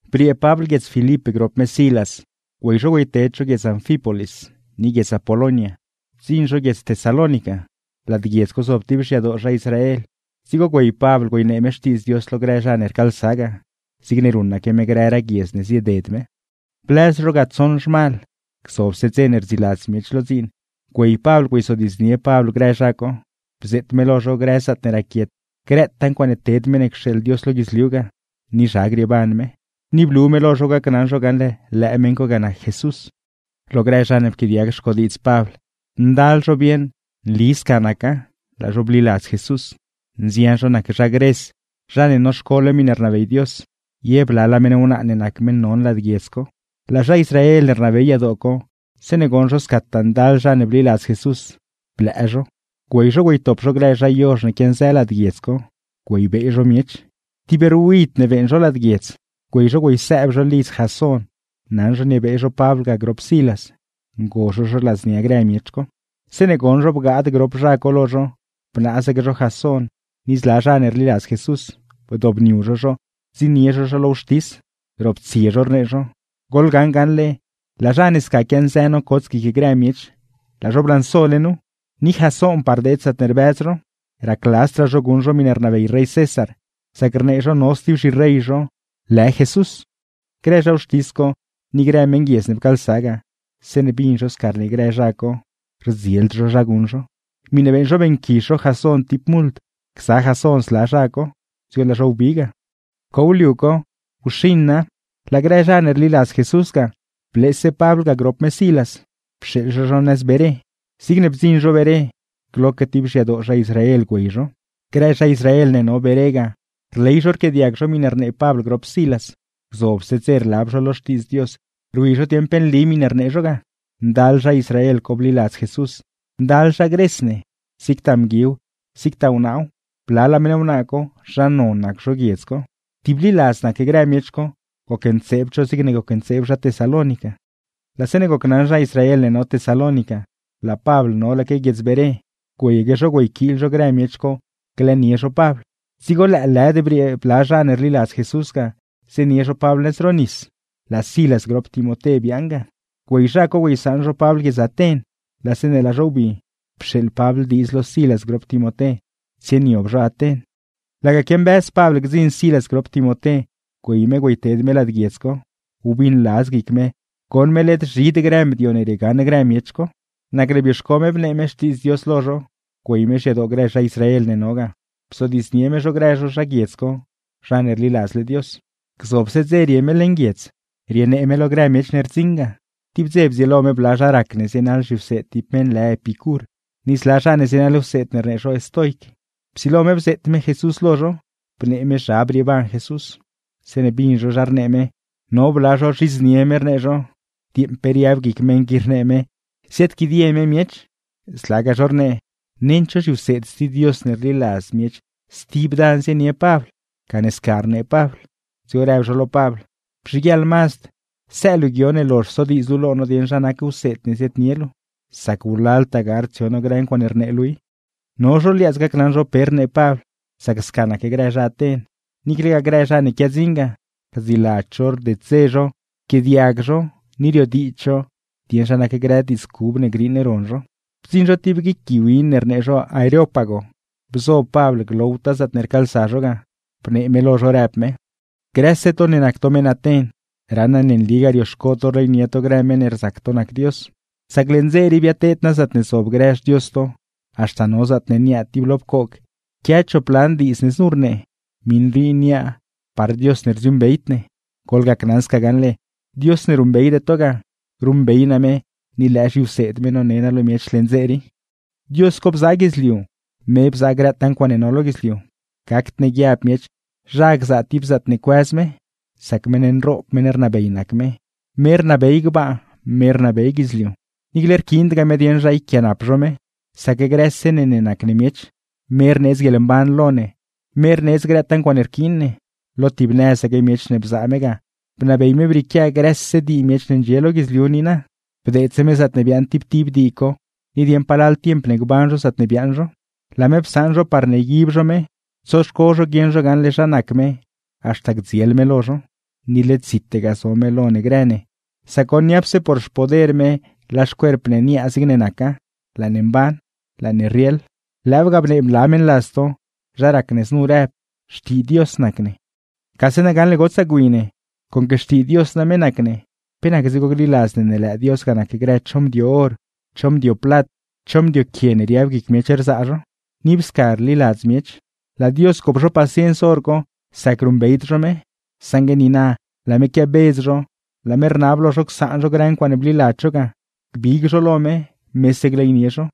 Briee Pabl guiedz Filip grop me Silas, güey zho güeyted zho guiedz Anfípolis ni guiedz Apolonia, bdziṉ zho guiedz Tesalónica. Lad guiedz co zob ti xyadoo zha Israel, dzigo güey Pabl güeynee me Xtiidz Dios lo grë zha ne rcaalsa ga, zigne ruṉaque me grëraa guiedz ne zieded me. Blëz zho ga tsoṉ zhmal, gzobse dze ne rdziiladz miech lo dziin güey Pabl güeyzodiidznie Pabl grë zha co, bzeet me lo zho grë zaatne raquiet grëtaa ncuaaṉe ted meṉ ne cxeeḻ Dios lo guidzliu ga, ni zha grieeban me; ni blu me lo zho gacnaṉ zho gaṉle lëë meṉ co ga nac Jesús. Ndal zha ne pquiaadiag xcodiidz Pabl, bieṉ zho ne nli sca naca, laa zho bliladz Jesús, ndal zho nac zha nëz Gres, zha ne noxcole miṉe rnabey Dios, ye blalaa meṉ wnaa ne nac meṉ non lad guiedz co. Laa zha Israel ne rnabey yadoo co, zeeṉe goṉ zho scataa ndal zha ne bliladz Jesús, blëë zho; güey zho güeytop zho grë zha yozh ne quianzë lad guiedz co, ti ruid ne beeṉ zho lad guiedz. Güey zho güeysëëb zho lidz Jasón naṉ zho niebee zho Pabl ga grop Silas, ngo zho zho ladznia grë miech co. Zeeṉe goṉ zho bgaad grop zha co lo zho, bnaazaque zho Jasón ni zla zha ne rliladz Jesús, bdobniu zho zho bdziṉnie zho zho lo wxtis, roptsie zho rnee zho: ―¡Goḻgaṉ gaṉle laa zha ne sca quianzë nocots guic grë miech, laa zho blansole nu! Ni Jasónpaa rdeed zaatne rbëz zho. Racladzdraa zho guṉ zho miṉe rnabey rey César, sac rnee zho no sti zhirey zho lë Jesús. Grë zha wxtis co ni grë meṉguiedz ne pcaalsa ga, zeeṉe bin zho sca rnee grë zha co, rieṉdraa zho zha guṉ zho. Miṉe beeṉ zho beeṉquizh zho Jasón ti mult gza Jasón zla zha co, dzigo laa zho wbi ga. Pcow liu co, wxiṉa laa grë zha ne rliladz Jesús ga bleese Pabl ga grop me Silas, pxeeḻ zho zho nëz Beré. Zigne bdziṉ zho Beré, gloque ti xyadoo zha Israel güey zho. Grë zha Israel ne no Beré ga, rley zho rquiaadiag zho miṉe rnee Pabl grop Silas, gzobse dze rlab zho lo Xtiidz Dios rwi zho dieṉ pe nli miṉe rnee zho ga. Ndal zha Israel co bliladz Jesús, ndal zha Gres ne, zigtaa mguiw zigtaa wnaaw; blalaa meṉ wnaa co zha non nac zho guiedz co. Tibliladz nac grë miech co, gocntseebd zho zigne gocntseeb zha Tesalónica. Laa zeeṉe gocnaṉ zha Israel ne no Tesalónica laa Pabl nolaque guiedz Beré, güeyaque zho güeyquiil zho grë miech co glëënie zho Pabl. Dzigo lëëlëd briee bla zha ne rliladz Jesús ga, zienie zho Pabl nëz ro nis; laa Silas grop Timoté biaaṉ ga. Güey zha co güeysaṉ zho Pabl guiedz Aten; laa zeeṉe laa zho wbi, pxeeḻ Pabl diidz lo Silas grop Timoté tsieniob zho Aten. Laga quiambëz Pabl gdziṉ Silas grop Timoté güey me güeyted me lad guiedz co, wbiṉladz guic me goṉ me led zhid grë mdio ne riegaṉ grë miech co. Nacne bioxco me bnee me Xtiidz Dios lo zho, güey me xyadoo grë zha Israel ne no ga, bzodiidznie me zho grë zho zha guiedz co zha ne rliladzle Dios. Gzobse dze rie me leṉ guiedz rienee me lo grë miech ne rdziṉ ga. Tib dze bdzieelo me bla zha rac ne zienaḻ zhiwseed ti meṉ lë Epicur, ni zla zha ne zienaḻ wseed ne rnee zho estoic; psilo me bzeet me Jesús lo zho, bnee me zha brieeban Jesús. Zeeṉe bin zho zha rnee me, no bla zho rzhidznie me, rnee zho: ―¡Dieeṉ pe riab guic meṉ qui rnee me, ziaadquidie me miech! Zlagaa zho rnee, nend cho zhiwseed sti Dios ne rliladz miech stib dan zienie Pabl, gane sca rnee Pabl; dzigo rëb zho lo Pabl: ―Bzhiguieḻ mazd, së luu guio ne lozh sodiidz luu lo no dieṉ zha nac wseed ne ziaadnie luu, sac wlaltaa gard dzion no grë ncuaaṉe rnee luu i. No zho liaadz gacnaṉ zho pe rnee Pabl, sac sca nac grë zha Aten, niiclegaa grë zha ne quiadziṉ ga, rdziladz zho rded-dze zho rzodiidz zho dieṉ zha nac grë diidz cub ne griiṉ ron zho. Bdziṉ zho ti guic gui win ne rnee zho Areópago, bzo Pabl glowtaa zaatne rcaalsa zho ga, bnee me lo zho rëb me: ―Grëse to ne nac to meṉ Aten, raṉ naa ne nligaa rioxco to rleynie to grë meṉ ne rzac to nac Dios; sac leṉ dze rii biateed naa zaatne zob grë xdios to, haxta no zaatne niaa ti lo pcoog quia chop lan diidz ne znu rnee: “MIṈ RII NIAA PAR DIOS NE RDZIUUṈBEYD NE.” Goḻgacnaṉ sca gaṉle, Dios ne ruṉbeyde to ga, ruṉbey naa me ni lëë zhiwseed me none naa lo miech leṉ dze rii. ’Dios co bzaa guidzliu, me bzaa grëtaa ncuaaṉe no lo guidzliu; gacd ne guiab miech zha gzaa ti zaatne cuëz me, sac meṉ nroob meṉ rnabey nac me, me rnabey gbaa, me rnabey guidzliu. Niicle rquiindgaa me dieṉ zha yquianap zho me, sac grëse ne ne nac ne miech, me rneedz guieḻmban lo ne, me rneedz grëtaa ncuaaṉe rquiin ne. Lo tib nëzaque miech ne bzaa me ga, bnabey me brieequia grëse dii miech ne ndxie lo guidzliu niina, bdeedse me zaatne biaaṉ tib tib dii co ni dieṉ palal dze ne gban zho zaatne biaaṉ zho. Laa me psaṉ zho parne yguib zho me, tsoxco zho guieṉ zho gaṉle zha nac me haxta gdziel me lo zho. Ni led zite ga zo me lo ne grë ne, sac goṉ, niapse por xpoder me laa xcuerp ne niaa zigne naca, laa ne mban, laa ne rrieḻ. Lëëw ga bnee bla meṉladz to, zha rac ne znu rëb: “Xtii Dios nac ne.” ’Gase na gaṉle gotsaa gwi ne, conque xtii Dios name nac ne, pe nac dzigo gliladz ne lëë Dios ga nac grë cho mdio or, cho mdio plat, cho mdio quie ne riab guic miech rzaa zho; ni ib sca rliladz miech. Laa Dios gop zho paciens hor co sac ruṉbeyd zho me; saṉgue niina laa me quiabedz zho, laa me rnab lo zho csaan zho grë ncuaaṉe bliladz zho ga gbig zho lo me, mese gleynie zho;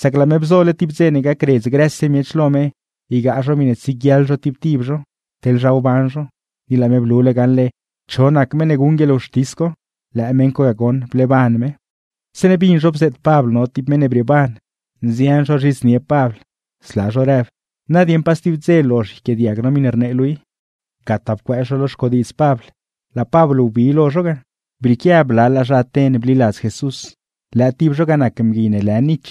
sac laa me bzole tib dze ne gacredz grëse miech lo me ygaa zho miṉe tsieguiaḻ zho tib tib zho, teḻ zha wban zho. Ni laa me blule gaṉle cho nac meṉ ne guṉ guieḻwxtis co, lëë meṉ co ga goṉ bleeban me. Zeeṉe bin zho bzeet Pabl no ti meṉ ne brieeban, nzian zho rzhidznie Pabl, zla zho rëb: ―Na dieṉ pa sti dze lozh yquiaadiag no miṉe rnee luu i. Gataa pcuëëz zho lo xcodiidz Pabl, laa Pabl wbi lo zho ga. Brieequia blalaa zha Aten bliladz Jesús, lëë tib zho ga nac mgui ne lë Nich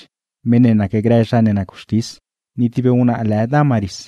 (meṉ ne nacgrë zha ne nac wxtis) ni ti wnaa lë Dámaris.